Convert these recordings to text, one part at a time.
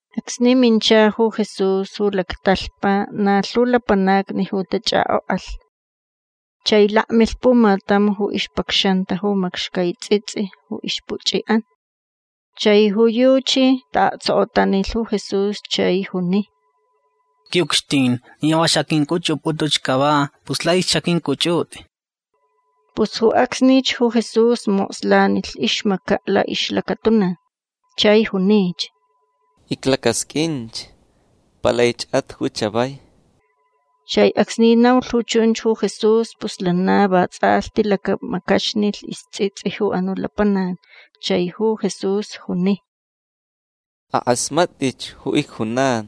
Acsni mincha ju Jesús ju lactalhpa na lhu lapanacni ju tachʼakʼokʼalh. Chai lakmilh pumatam ju ixpacxanta ju macxcai tsʼitsʼi ju ixpuchʼiʼan. Chai ju yuchi taʼaktsokotanilh ju Jesús chai juni: ―Quiʼucxtin ni va xaqʼuincʼuchʼupʼutʼuch cava pus laich xaqʼuincʼuchʼutʼi. Pus ju acsnich ju Jesús mokslanilh ixmacaʼ laʼixlacatuna. Chai junich: ―Iclacasqʼuinch. Palaichʼat ju chavai. Chai acsni naulh ju chunch ju Jesús pus lana vatsʼalhti lacamacaxnilh istsʼitsʼi ju anuʼ lapanac. Chai ju Jesús juni: ―Akʼasmatʼich ju icjunan.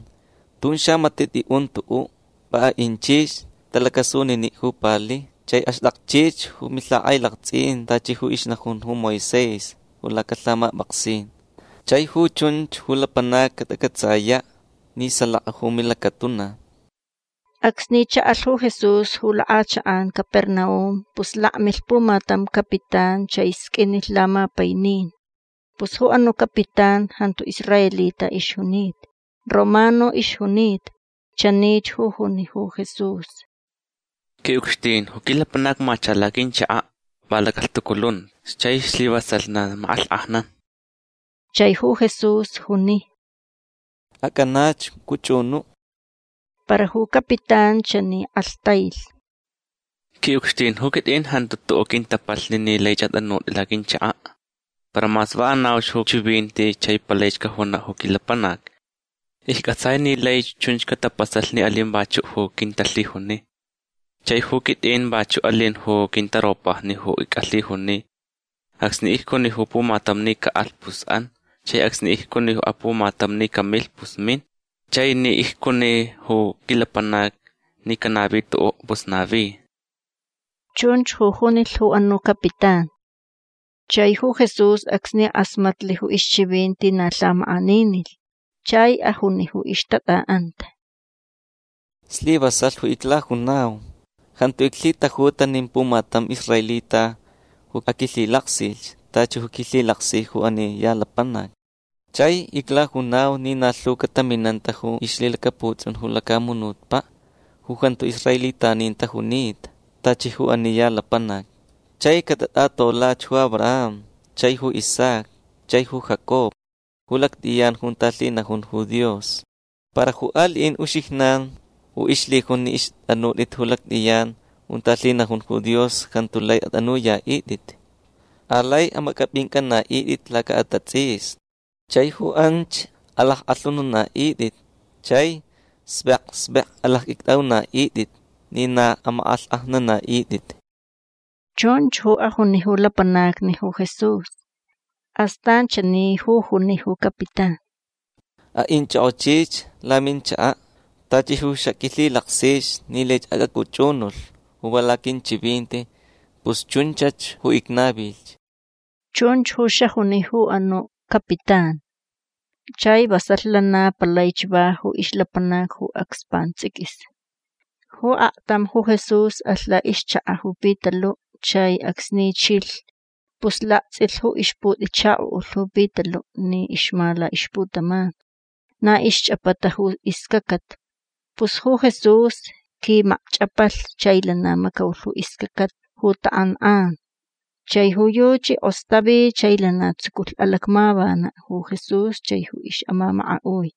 Tun xamatiʼ tʼiʼun tuʼuʼ. Va aʼinchich tʼalacʼasuniniʼ ju pali chai axtʼakchich ju milhakʼailaktsʼin tachi ju ixnajun ju Moisés lacalhamapʼaksin. Chai ju chunch ju lapanacni catacʼatsayaʼ ni salaka ju milacatuna. Acsni chaʼalh ju Jesús ju lakʼachakʼan Capernaum pus lakmilh pumatam capitán chai sqʼuinilh lamapainin. Pus ju anuʼ capitán jantu israelita ixjunita. Romano ixjunita. Chanich ju juni ju Jesús: ―Quiʼucxtin ju quilapanac macha laquinchakaʼ. Va lacalhtuculunta chai slivasalh na makʼalhkʼajnan. Chai ju Jesús juni: ―Acʼanach cʼuchʼunuʼ. Para ju capitán chani kʼalhtailh: ―Quiʼucxtin ju quitʼin jantu tuʼuʼ quintapalhni ni laich atʼanutʼi laquinchakaʼ. Para mas va anauch ju chivinti chai palaich cajunaʼ ju quilapanac. Iccʼatsai ni laich chunch catapasalh ni alin vachuʼ ju quintalhijuni. Chai ju quitʼin vachuʼ alin ju quintaropajni ju icʼalhijuni. Acsni icjuni ju pumatam ni caʼalh pus an. Chai acsni icjuni apumatam ni camilh pus min. Chai ni icjuni ju quilapanac ni canavi tuʼuʼ pus navi. ―Chunch ju junilh ju anuʼ capitán. Chai ju Jesús acsni kʼasmatlh ju ixchivinti na lhamakʼaninilh. Chai ajuni ju ixtatʼaʼanta: ―Slivasalh ju iclajunau. Jantu iclhitajuta nin pumatam israelita ju aquilhilaksilh tachi ju quilhilaksi ju ani ya lapanac. Chai iclajunau ni na lhu cataminanta ju ixlhilacaputsʼun ju lacamunutpaʼ ju jantu israelitanin tajunita tachi ju ani ya lapanac. Chai catatʼatolach ju Abraham chai ju Isaac chai ju Jacob ju lactʼiyan junta lhinajun ju Dios. Para ju aliʼin uxijnan ju ixlhijun ni ixtʼanutʼit ju lactʼiyan junta lhinajun ju Dios jantu lai atʼanuyaʼitʼit. Alai amacʼapʼincʼanaʼitʼit lacaʼatatsʼisni. Chai ju anch alackʼalhununaʼitʼit chai xvek xvek alacqʼuictʼaʼunaʼitʼit ni na amakʼalhkʼajnanaʼitʼit. ―Chunch ju ajuni ju lapanacni ju Jesús. Astan chani ju juni ju capitán: ―Aʼinchʼokʼochich laminchakaʼ. Tachi ju xaqʼuilhilaksich ni laich acʼacʼuchʼunulh va laquinchivinti pus chunchach ju icnavilh. ―Chunch ju xajuni ju anuʼ capitán. Chai vasalh lana palaich va ju ixlapanac ju acs pantsʼiquis. Ju aktam ju Jesús alh laʼixchakaʼ ju Pitaluʼ chai acsni chilh pus laktsʼilh ju ixputʼichakoʼulh ju Pitaluʼ ni ixma laʼixputaman. Na ixchʼapata ju iscacat. Pus ju Jesús quimacchʼapalh chai lana macaulh ju iscacat ju takʼankʼan. Chai ju yuchi kʼostavi chai lana tsuculh alacmavanaʼ ju Jesús chai ju ixʼamamakaʼui.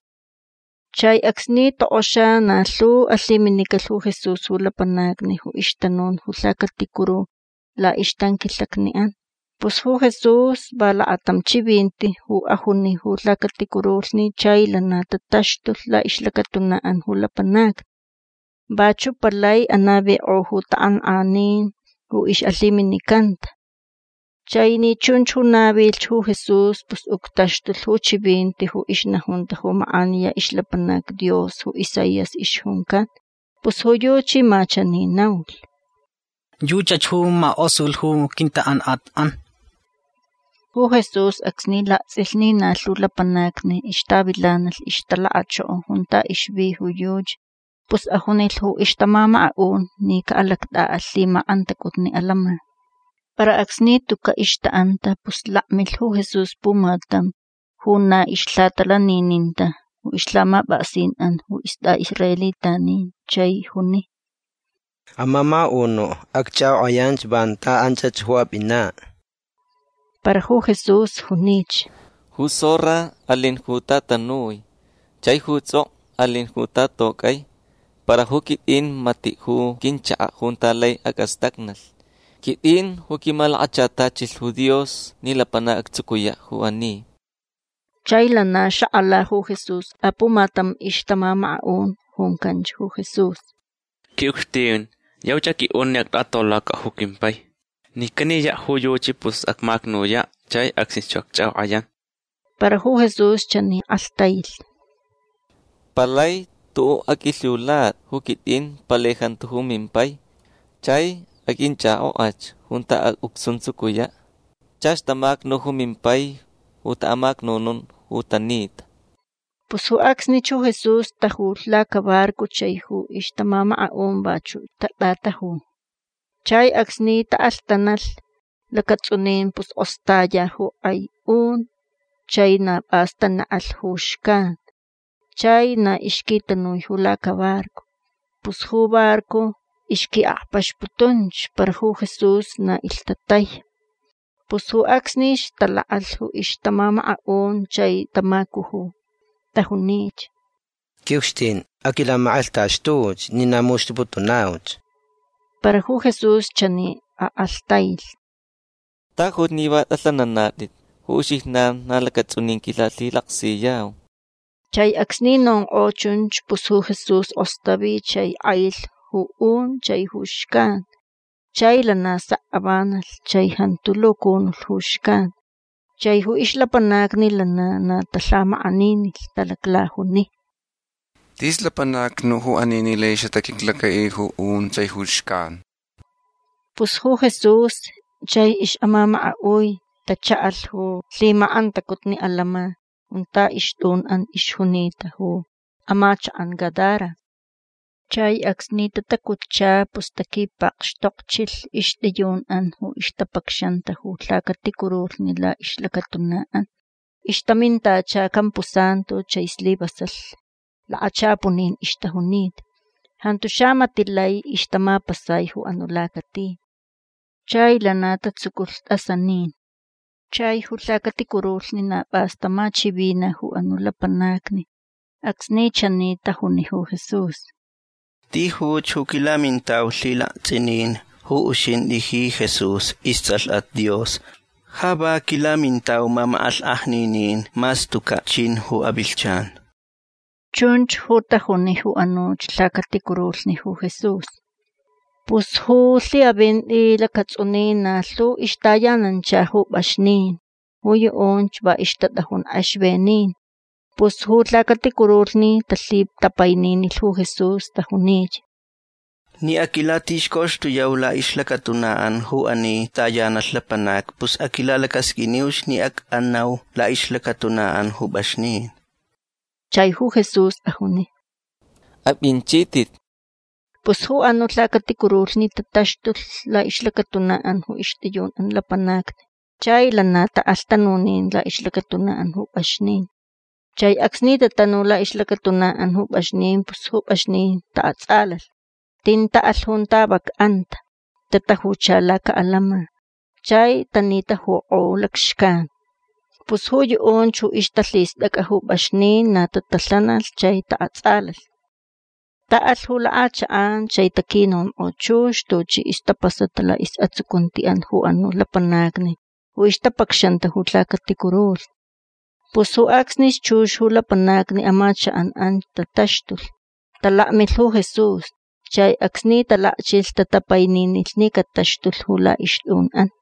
Chai acsni tokʼoxa na lhu alhiminicalh ju Jesús ju lapanacni ju ixtanun ju lhacaticuru laʼixtanquilhacniʼan. Pus ju Jesús va lakatam chivinti ju ajuni ju lhacaticurulhni chai lana tataxtulh laʼixlacatunaʼan ju lapanacni. Vachuʼ palai anavikʼo ju takʼankʼanin ju ixʼalhiminicanta. Chai ni chunch ju navilhch ju Jesús pus uctaxtulh ju chivinti ju ixnajunta ju makʼaniya ixlapanac Dios ju Isaías ixjuncan. Pus ju yuchi ma chani naulh: “Yuchach ju makʼosulh ju quintakʼankʼatʼan”. Ju Jesús acsni laktsʼilh ni na lhu lapanacni ixtavilanalh ixtalakachoko junta ixvi ju yuchi pus ajunilh ju ixtamamakaʼun ni caʼalactʼaʼalh lhimakʼantacutni atantsʼin. Para acsni tucaʼ ixtaʼanta pus lakmilh ju Jesús pumatam ju na ixlhatalanininta ju ixlhamapʼaksinʼan ju istʼaʼisraelitanin chai juni: ―Amamakaʼunuʼ acchʼakʼokʼayanch vanta anchach ju apʼinaʼ. Para ju Jesús junich: ―Ju zorra alin junta tanui. Chai ju tsʼokʼo alin junta tatocʼai. Para ju quitʼin matiʼ ju quinchakaʼ junta lai acʼastacnalh. Quitʼin ju quimalakachatachilh ju Dios ni lapanac actsucuyaʼ ju ani. Chai lana xakʼala ju Jesús apumatam ixtamamakaʼun. Juncanch ju Jesús: ―Quiʼucxtin yauch aqʼuiʼun ni actʼatolacaʼ ju quimpai. Ni caniyaʼ ju yuchi pus acmacnuyaʼ chai acsnich ju acchʼakʼokʼayan. Para ju Jesús chani kʼalhtailh: ―Palai tuʼuʼ aqʼuilhiulatʼi ju quitʼin. Palai jantu ju mimpai. Chai aqʼuinchʼakʼokʼach junta acʼuctsuntsucuyaʼ. Chach tamacnu ju mimpai ju taʼamacnunun ju tanita. Pus ju acsnich ju Jesús tajulh lacabarco chai ju ixtamamakaʼun vachuʼ tatʼataju. Chai acsni taʼalhtanalh lacatsʼunin pus kʼostaya ju kʼai un chai na pʼas tanekʼalh ju xcan. Chai na ixquitanui ju lacabarco. Pus ju barco ixquiʼakpaxputunch. Para ju Jesús na ilhtatai. Pus ju acsnich talakʼalh ju ixtamamakaʼun chai tamacuju. Tajunich: ―Quiʼucxtin aquilamakʼalhtaxtuch ni na muxtuputunauch. Para ju Jesús chani akʼalhtailh: ―Tajuch ni va tʼalhananatʼit. Ju uxijnan na lacatsʼunin quilalhilaksiyau. Chai acsni nonkʼo chunch pus ju Jesús kʼostavi chai kʼailh ju un chai ju xcan. Chai lana sek avanalh chai jantu lucunulh ju xcan. Chai ju ixlapanacni lana na talhamakʼaninilh. Talaclajuni: ―Tis lapanac nuʼ ju ani ni lai xataquiclacaʼi ju un chai ju xcan. Pus ju Jesús chai ixʼamamakaʼui tachaʼalh ju lhimakʼantacutni atantsʼin junta ixtʼunʼan ixjunita ju amachakʼan Gadara. Chai acsni tatacutcha pus taquipakxtokchilh ixtʼiyunʼan ju ixtapacxanta ju lhacaticurulhni laʼixlacatunaʼan. Ixtamintacha campusantu chai slivasalh lakachapunin ixtajunita. Jantu xamatiʼ lai ixtamapasai ju anuʼ lacati. Chai lana tatsuculh tʼasanin. Chai ju lhacaticurulhni na pʼas tamachivina ju anuʼ lapanacni acsni chani tajuni ju Jesús: ―Tijuch ju quilamintau lhilaktsʼinin ju uxintʼi ji Jesús istsʼalhʼat Dios. Ja va quilamintau mamakʼalhkʼajninin mas tucaʼ chin ju avilhchan. ―Chunch ju tajuni ju anuch lhacaticurulhni ju Jesús. Pus ju lhiʼavinti lacatsʼunin na lhu ixtayanancha ju pʼaxnin. Ju yuʼunch va ixtatʼajun kʼexvenin. Pus ju lhacaticurulhni talhitapaininilh ju Jesús. Tajunich: ―Ni aquilatixcoxtuyau laʼixlacatunaʼan ju ani tayanalh lapanacni pus aquilalacasqʼuiniuch ni acʼanau laʼixlacatunaʼan ju pʼaxnin. Chai ju Jesús ajuni: ―Apʼinchitʼit. Pus ju anuʼ lhacaticurulhni tataxtulh laʼixlacatunaʼan ju ixtʼiyunʼan lapanacni chai lana taʼalh tanunin laʼixlacatunaʼan ju pʼaxnin. Chai acsni tatanu laʼixlacatunaʼan ju pʼaxnin pus ju pʼaxnin taʼatsʼalalh. Tin taʼalh junta vac anta. Tatajucha lacaʼatantsʼin chai tanitajukʼo lacxcan. Pus ju yuʼunch ju ixtalhistʼacʼa ju pʼaxnin na tatalhanalh chai taʼatsʼalalh. Taʼalh ju lakʼachakʼan chai taquinonkʼo chux tuchi ixtapasata laʼisʼatsucuntiʼan ju anuʼ lapanacni ju ixtapacxanta ju lhacaticurulhni. Pus ju acsnich chux ju lapanacni amachakʼan anch tataxtulh. Talakmilh ju Jesús. Chai acsni talakchilh tatapaininilh ni cataxtulh ju laʼixtʼunʼan.